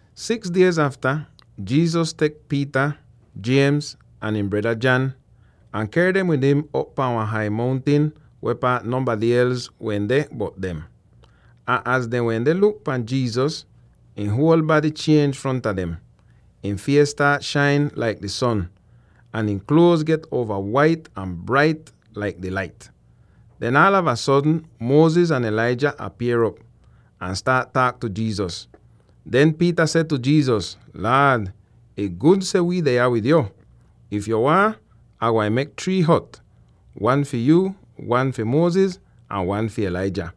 Six diez afta, Jesus tek Peter, James, ahn ihn breda John, ahn ker dem wid im op pahn wan hai mountin weh paat nonbady els wehn deh bot dem. Ahn az dehn wende luk pahn Jesus, ihn huol bady chienj fronta dem: ihn fies staat shain laik di son, ahn ihn kluoz get uova wait ahn brait laik di lait. Den aalava sodn Moses ahn Elijah apier'op, ahn staat taak tu Jesus. Den Peter seh tu Jesus, “Laad, ih gud seh wi deh yah wid yo! If yo waahn, Ah gwain mek three hot —wan fi yuu, wan fi Moses, ahn wan fi Elijah.”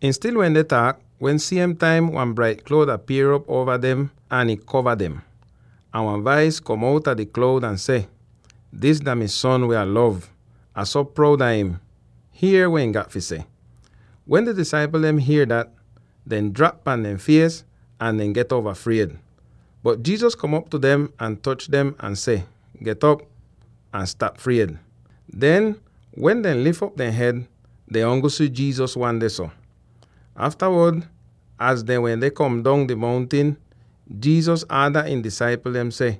Ihn stil wende taak, wen siem taim wan brait kloud apier'op uova dem ahn ih kova dem. Ahn wan vais kom outa di kloud ahn seh, “Dis dah mi Son weh Ah lov. Ah so proud a im. Hier weh ihn gat fi seh!” Wen di disaipl dem hier dat, dehn drap pahn dehn fies ahn dehn get uova fried. Bot Jesus kom op tu dem ahn toch dem, ahn seh, “Get'op, ahn stap fried.” Den, wen dehn lif op dehn hed, dehn ongl si Jesus wan dehso. Aftawod, az dehn wende kom dong di mountin, Jesus aada ihn disaipl dem seh,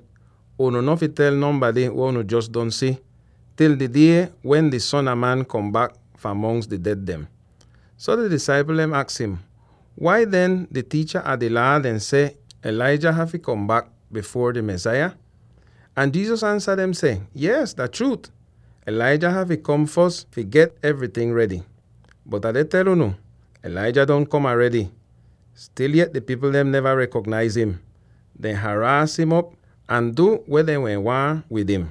“Unu no fi tel nonbady weh unu jos don si, til di die wen di Son a Man kom bak fahn mongs di ded dem.” So di disaipl dehn aks im, “Wai den, di tiicha a di Laa dehn seh Elijah hafy kom bak bifuor di Mesaya?” Ahn Jesus ansa dem seh, “Yees, dah chruut, Elijah hafy kom fos fi get evryting redy. Bot Ah deh tel unu: Elijah don kom aredy. Stil yet di pipl dem neva rekonaiz im; dehn haraas im op ahn dehn du weh dehn wehn waahn wid im.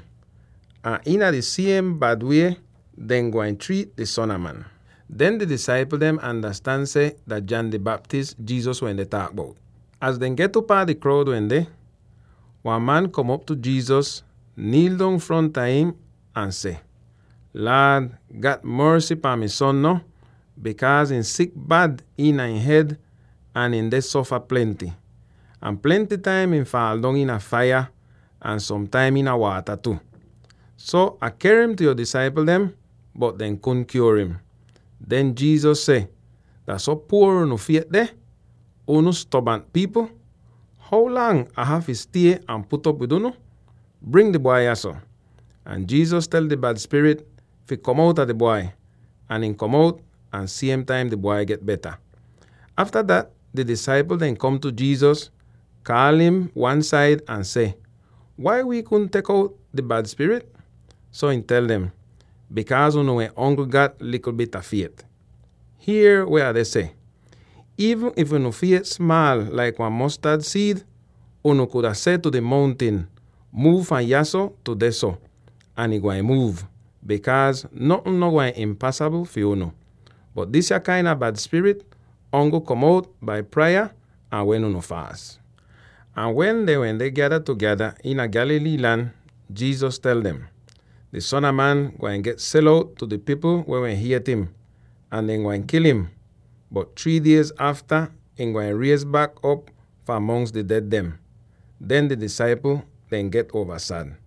Ahn iina di siem bad wie dehn gwain triit di Son a Man.” Den di disaipl dem andastan seh dah John di Baptist, Jesus wende taak bout. Az dehn get upaa di kroud wende, wan man kom op tu Jesus, niil dong fronta im ahn seh, “Laad, gat morsy pahn mi son, no, bikaaz ihn sik bad iina ihn hed ahn ihn deh sofa plenty. Ahn plenty taim ihn faal dong iina faiya, ahn som taim iina waata tu. So Ah ker im tu yo disaipl dem, bot dehn kudn kyuor im.” Den Jesus seh, “Dah so puor unu fiet deh, unu stobant pipl! How lang Ah hafy stie ahn put'op wid unu? Bring di bwai yahso!” Ahn Jesus tel di bad spirit fi kom outa di bwai; ahn ihn kom out, ahn siem taim di bwai get beta. Afta dat di disaipl dehn kom tu Jesus, kaal im wan-said ahn seh, “Wai wii kudn tek out di bad spirit?” So ihn tel dem, “Bikaaz unu wehn ongl gat likl bit a fiet. Hier weh Ah deh seh: iivn if unu fiet smaal laik wan mostad siid, unu kuda seh tu di mountin, ‘Muuv fahn yahso tu dehso,’ ahn ih gwain muuv, bikaaz notn no gwain impasabl fi unu! [Bot disya kain a bad spirit ongl kom out bai praya ahn wen unu faas.]” Ahn wen dehn wende gyada tugeda iina Galilee lan, Jesus tel dem, “Di Son a Man gwain get sel out tu di pipl weh hiet im, ahn dehn gwain kil im. Bot three diez afta ihn gwain riez bak op fahn mongs di ded dem.” Den di disaipl dehn get uova sad.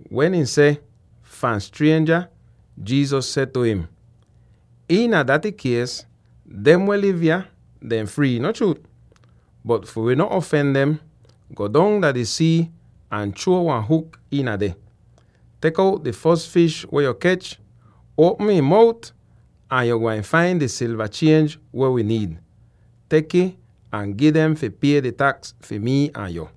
Wen ihn seh, “—fahn strienja,” Jesus seh tu im, “Iina daty kies, dem weh liv yah, dehn frii, no chruut? Bot, fi wi no afen dem, go dong dah di sii ahn chruo wan huk iin deh. Tek out di fos fish weh yo kech, uopm ihn mout, ahn yo gwain fain di silva chienj weh wi niid. Tek'ih ahn gi dem fi pie di taks fi mii ahn yo.”